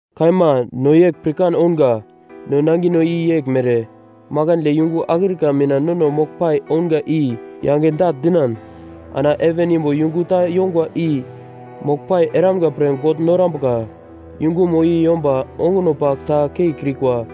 Kaima, no yegl pirkan ounga, no nangino i yeglmere: Makandle yungu akrika mina nono moglpai ounga i yange dagl dinan, ana heven imbo yungu ta yongwa i moglpai eramga pre God norambuka. Yungumo i yomba onguno pagl ta keikrikwa,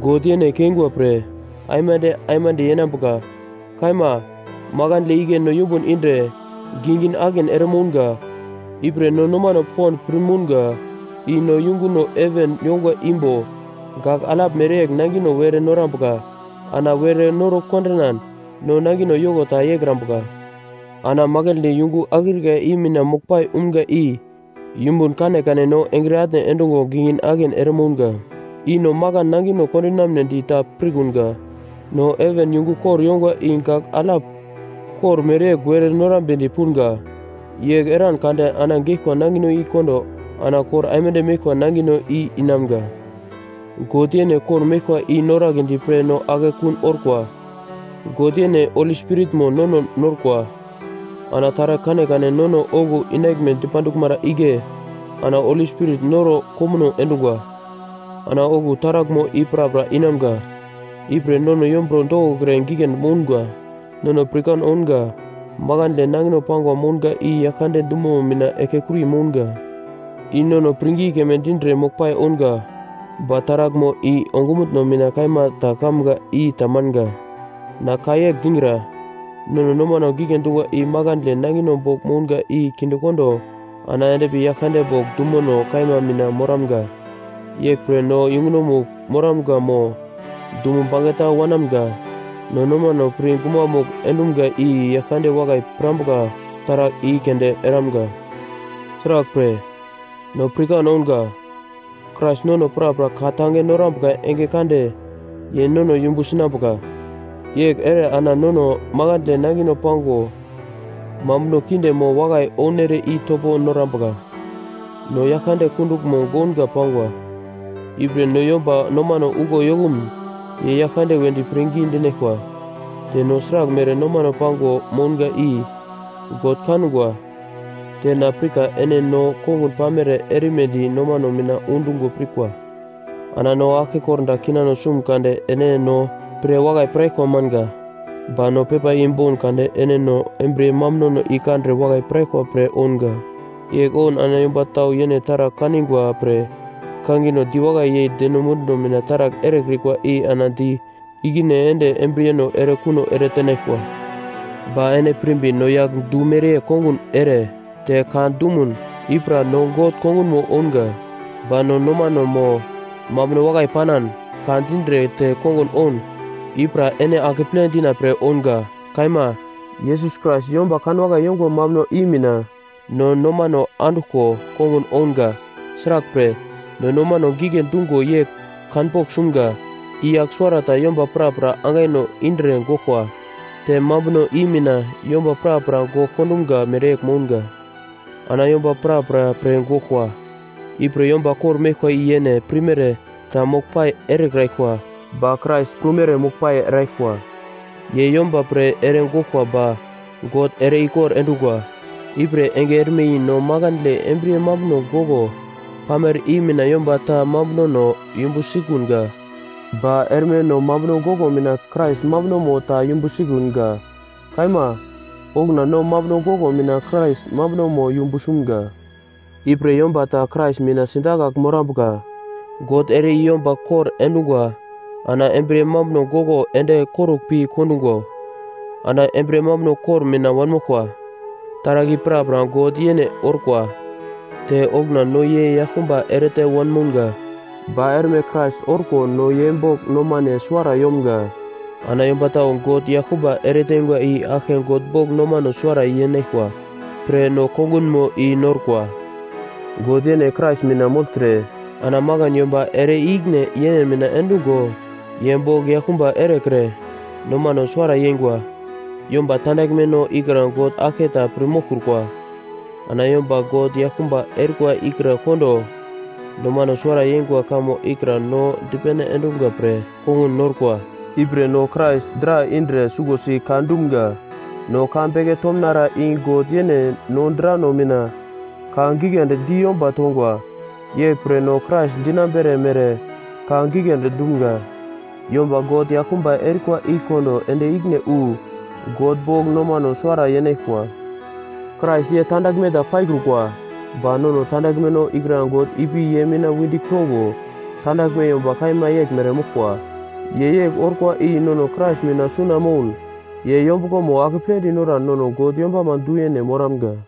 God yene keingwa pre aimande aimande yenambuka. Kaima, makandle igle no yumbun indre gingin-akin ere mounga, ipre no nomano pond pir mounga i no yunguno heven yongwa imbo gagl alap mereyegl nangino were norambuka. Ana were noro kondinan no nangino yoko ta yeikrambuka. Ana makandle yungu akrika i mina moglpai umga i, yumbun kanekane no engre atne endungo gingin-akin ere mounga. I no makan nangino kondinamnedi ta pirkunga, no heven yungu kor yongwa i gagl alap kor mereyegl were norambedi punga. Yegl eran kade ana geglkwa nangino i kondo ana kor aimande meglkwa nangino i inamga. God yene kor-meglkwa i noragledi pre no akekun orkwa. God yene Holi Spiritmo nono norkwa. Ana taragl kanekane nono okuwo inaglme dipanduglmara igle ana Holi Spirit noro komuno endungwa. Ana okuwo taraglmo i prapra inamga. Ipre nono yomburo dokokre giglendi mounga. Nono pirkan ounga makandle nangino pangwa mounga i Yaglkande dumomo mina eglkekuri mounga. I nono pirngi keme dindre moglpai ounga, ba taraglmo i ongumutno mina kaima ta kamga i tamanga. Na ka yegl digra, nono nomano gigle dungwa i makandle nangino bogl mounga i kindekondo ana endpi Yaglkande bogl dumono kaima mina moramga. Yeglpre no yungunomugl moramga mo dumo bangeta wanamga, no nomano pir gumamugl endumga i Yaglkande wakai pirambuka taragl i keunde eramga. Sraglpre, no pirkan ounga, Krais nono prapra ka tange norambuka enge kande ye nono yumbu sinambuka. Yegl ere ana nono makandle nangino pango mambuno kinde mo wakai ounere i topo norambuka. No Yaglkande kunduglmo gounga pangwa. Ipre no yomba nomano uglo yokumun ye Yaglkande wedi pirngi dinaglkwa. Te no sraglmere nomano pago mounga i God kangwa, te na pirka ene no kongun pamere erimedi nomane mina undungo pirkwa. Ana no aglke kordagl kinano sumun kade ene no pre wakai piraglkwa manga. Ba no pepa i boun kade ene no embriye mambunono i kandre wakai piraglkwa pre ounga. Yegl oun ana yomba tau yene taragl kaningwa pre kangino diwakai yei deno munduno mina taragl erekrikwa i ana di ikine ende embriyeno ere kuno ere tenaglkwa. Ba ene pirmbi no yagl du mereyegl kongun ere te ka dumun, i pra no God kongunmo ounga; ba no nomano mo mambuno wakai panan, ka dindre te kongun oun, i pra ene akeple dina pre ounga. Kaima, Yesus Krais yomba kanwakai yongwa mambuno i mina no nomano anduglko kongun ounga. Sraglpre, no nomano gigle dungo yegl kanpogl sumga, i yagl suwarata yomba prapra angaino indre goglkwa, te mambuno i mina yomba prapra gogl kondumga mereyegl mounga. Ana yomba prapra pre goglkwa, ipre yomba kor-meglkwa i yene pirmere ta moglpai erekraglkwa, ba Krais prumere moglpai eraglkwa. Ye yomba pre ere goglkwa ba God ere-ikor endungwa. Ipre enge erme i no makandle embriye mambuno goglo pamere i mina yomba ta mambunono yumbu sikunga. Ba erme no mambuno goglo mina Krais mambunomo ta yumbu sikunga. Kaima, okuna no mambuno goglo mina Krais mambunomo yumbu sumga. Ipre yomba ta Krais mina sidakagl morambuka, God ere i yomba kor endungwa ana embriye mambuno goglo ende korugl pi kondugo, ana embriye mambuno kor mina wanmoglkwa. Taragl i prapra God yene orkwa. Te okuna no ye yaglkumba erete wanmounga, ba erme Krais orko no ye bogl nomane suwara yomga. Ana yomba tau God yaglkumba eretengwa i aglke God bogl nomano suwara yenaglkwa pre no kongunmo i norkwa. God yene Krais mina mogltre ana makan yomba ere i-ikine yene mina endungo ye bogl yaglkumba erekre nomano suwara yeingwa. Yomba tandaglmeno ikra God aglke ta pir moglkrukwa. Ana yomba God yaglkumba erikwa ikra kondo nomano suwara yeingwa kamo ikra no dipene endumga pre kongun norkwa. Ipre no Krais dra indre suglosi ka dumga, no ka beke tomnara i God yene no drano mina ka giglendi di yomba tongwa. Yeglpre no Krais dinambere mere ka giglendi dumga, “Yomba God yaglkumba erikwa i kondo ende ikine wu God bogl nomano suwara yenaglkwa.” Krais ye tandaglme ta paikrukwa, ba nono tandaglmeno ikra God ipi ye mina wendigl tongo tandaglme yomba kaima yeglmere moglkwa. Ye yegl orkwa i nono Krais mina suna moun ye yombuglomo akepledi noran nono God yombama du-yene moramga.